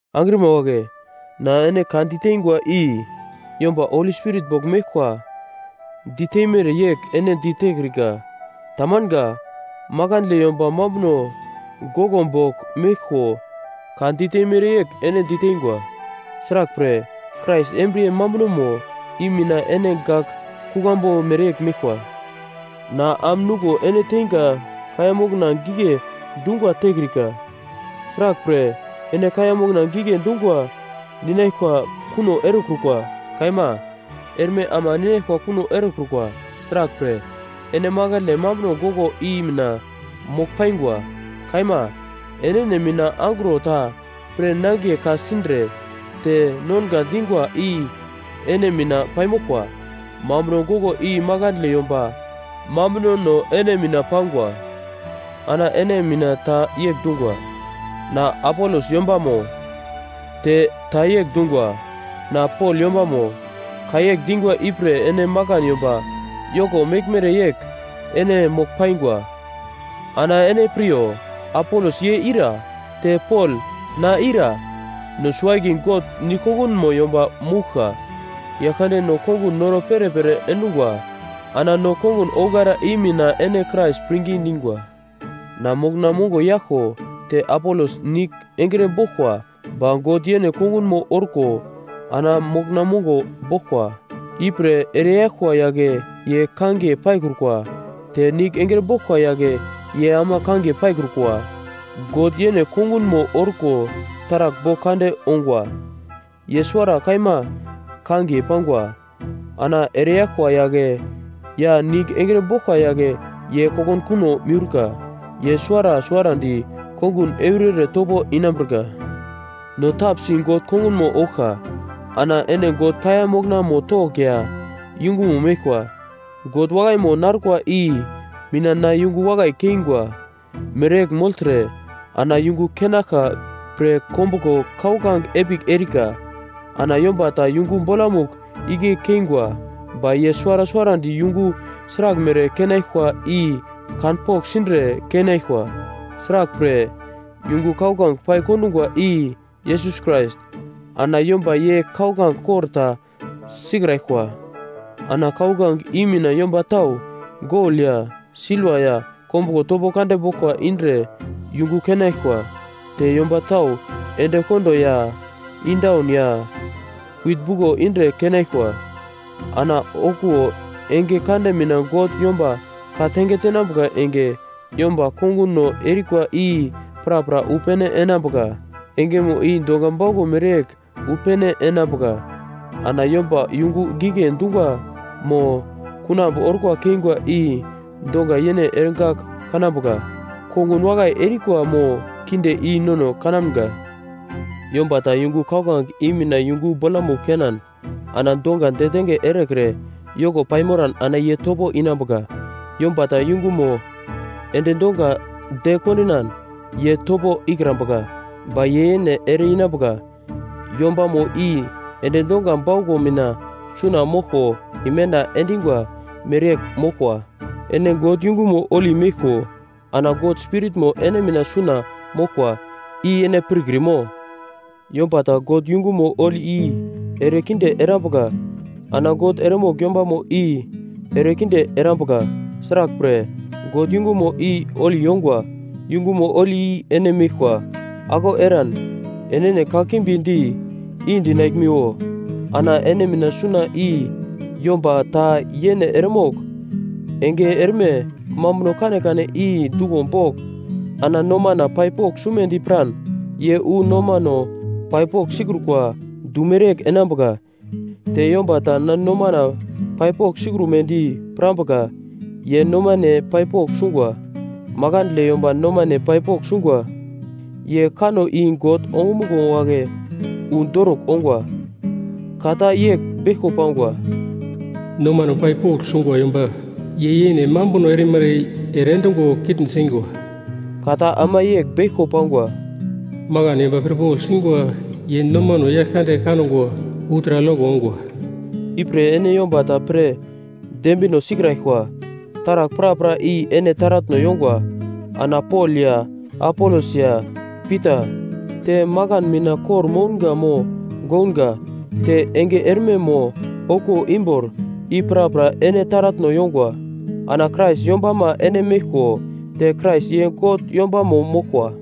Angrima wagle, na ene ka diteingwa i yomba Holi Spirit bogl meglkwa diteimere yegl ene ditekrika. Tamanga. Makandle yomba mambuno goglo bogl meglko ka diteimere yegl ene diteingwa. Sraglpre, Krais embriye mambunomo i mina ene gak kuglambu mereyegl meglkwa. Na am nuglo ene teinga kaiya mokna gigle dungwa tekrika. Sraglpre, ene kaiya mokna gigle dungwa ninaglkwa kuno erekrukwa. Kaima, erme ama ninaglkwa kuno erekrukwa. Sraglpre, ene makandle mambuno goglo i mina mogl paingwa. Kaima, enene mina angro ta pre nangiye ka-sindre te nonga dingwa i ene mina paimoglkwa. Mambuno goglo i makandle yomba mambunono ene mina pangwa. Ana ene mina ta yegl dungwa, “Na Apolos yombamo.” Te ta yegl dungwa, “Na Pol yombamo.” Ka yegl dingwa ipre ene makan yomba yoko meglmere yegl ene mogl paingwa. Ana ene piryo. Apolos ye ira? Te Pol, na ira? No suwo-akiye God nigl kongunmo yomba mouglka. Yaglkande no kongun noro perepere endungwa. Ana no kongun ouglara i mina ene Krais pirngi dingwa. Na mokna mongo yaglko, te Apolos nigl engre boglkwa, ba God yene kongunmo orko ana mokna mongo boglkwa. Ipre ereyaglkwa yagle ye kangiye paikrukwa, te nigl engre boglkwa yagle ye ama kangiye paikrukwa. God yene kongunmo orko taragl bogl kande ongwa. Ye suwara kaima kangiye pangwa. Ana ereyaglkwa yagle ya nigl engre boglkwa yagle ye kokunkuno miurka. Ye suwara suwarandi kongun eurere topo inambirka. No tapsi God kongunmo ouglka. Ana ene God kaiya moknamo togl ya yungumo meglkwa. God wakaimo narkwa i mina na yungu wakai keingwa mereyegl mogltre ana yungu keinaglka pre kombuglo kauglange epigl erika. Ana yomba ta yungu bolamugl igle keingwa. Ba ye suwara suwarandi yungu sraglmere keinaglkwa i kanpogl sindre keinaglkwa. Sraglpre, yungu kauglange pai-kondungwa, i Yesus Krais. Ana yomba ye kauglange kor ta sikraglkwa. Ana kauglange i mina yomba tau, gol ya silva ya kombuglo topo kande boglkwa indre yungu keinaglkwa, te yomba tau endekondo ya indaun ya wit buglo indre keinaglkwa. Ana okuwo enge kande mina God yomba ka-tange tenambuka enge, yomba konguno erikwa i prapra wu pene enambuka. Engemo i dongwa bauglo mereyegl wu pene enambuka, ana yomba yungu gigle dungwa mo kunambu orkwa keingwa i donga yene eregagl kanambuka. Kongun wakai erikwa mo kinde i nono kanamga. Yomba ta yungu kauglange i mina yungu bolamugl keinan ana donga detenge erekre yoko paimoran ana ye topo inambuka. Yomba ta yungumo endi donga de kondinan ye topo ikrambuka, ba ye yene ere-inambuka, yombamo i endi donga bauglo mina suna moglko imenda endingwa mereyegl moglkwa. Ene God yungumo holi meglko ana God Spiritmo ene mina suna moglkwa. I ene pirkrimo? Yomba ta God yungumo holi i erekinde erambuka, ana God eremogl yombamo i erekinde erambuka. Sraglpre, God yungumo i holi yongwa. Yungumo holi i ene meglkwa. Aglau eran enene kakimbi di i-dinaglmiwo. Ana ene mina suna i yomba ta yene eremogl enge erme mambuno kanekane i duglo bogl ana nomana pai pogl sumedi piran, ye wu nomano pai pogl sikrukwa du mereyegl enambuka. Te yomba ta na nomana pai pogl sikrumedi pirambuka, ye nomane pai pogl sungwa. Makandle yomba nomane pai pogl sungwa ye kanno i God ongumuglo wagle wu dorugl ongwa. Ka ta yegl beglko pangwa: “Nomano pai pogl sungwa yomba ye yene mambuno erimara i ere endungo kitn singwa.” Ka ta ama yegl beglko pangwa: “Makan yomba pirpogl singwa ye nomano Yaglkande kangwa wu taragl yoko ongwa.” Ipre ene yomba ta pre dembino sikraglkwa. Taragl prapra i ene taratno yongwa. Ana Pol ya Apolos ya Pita, te makan mina kor-mounga mo gounga, te enge erme mo okuwo imbor, i prapra ene taratno yongwa. Ana Krais yombama ene meglko te Krais ye God yombamo moglkwa.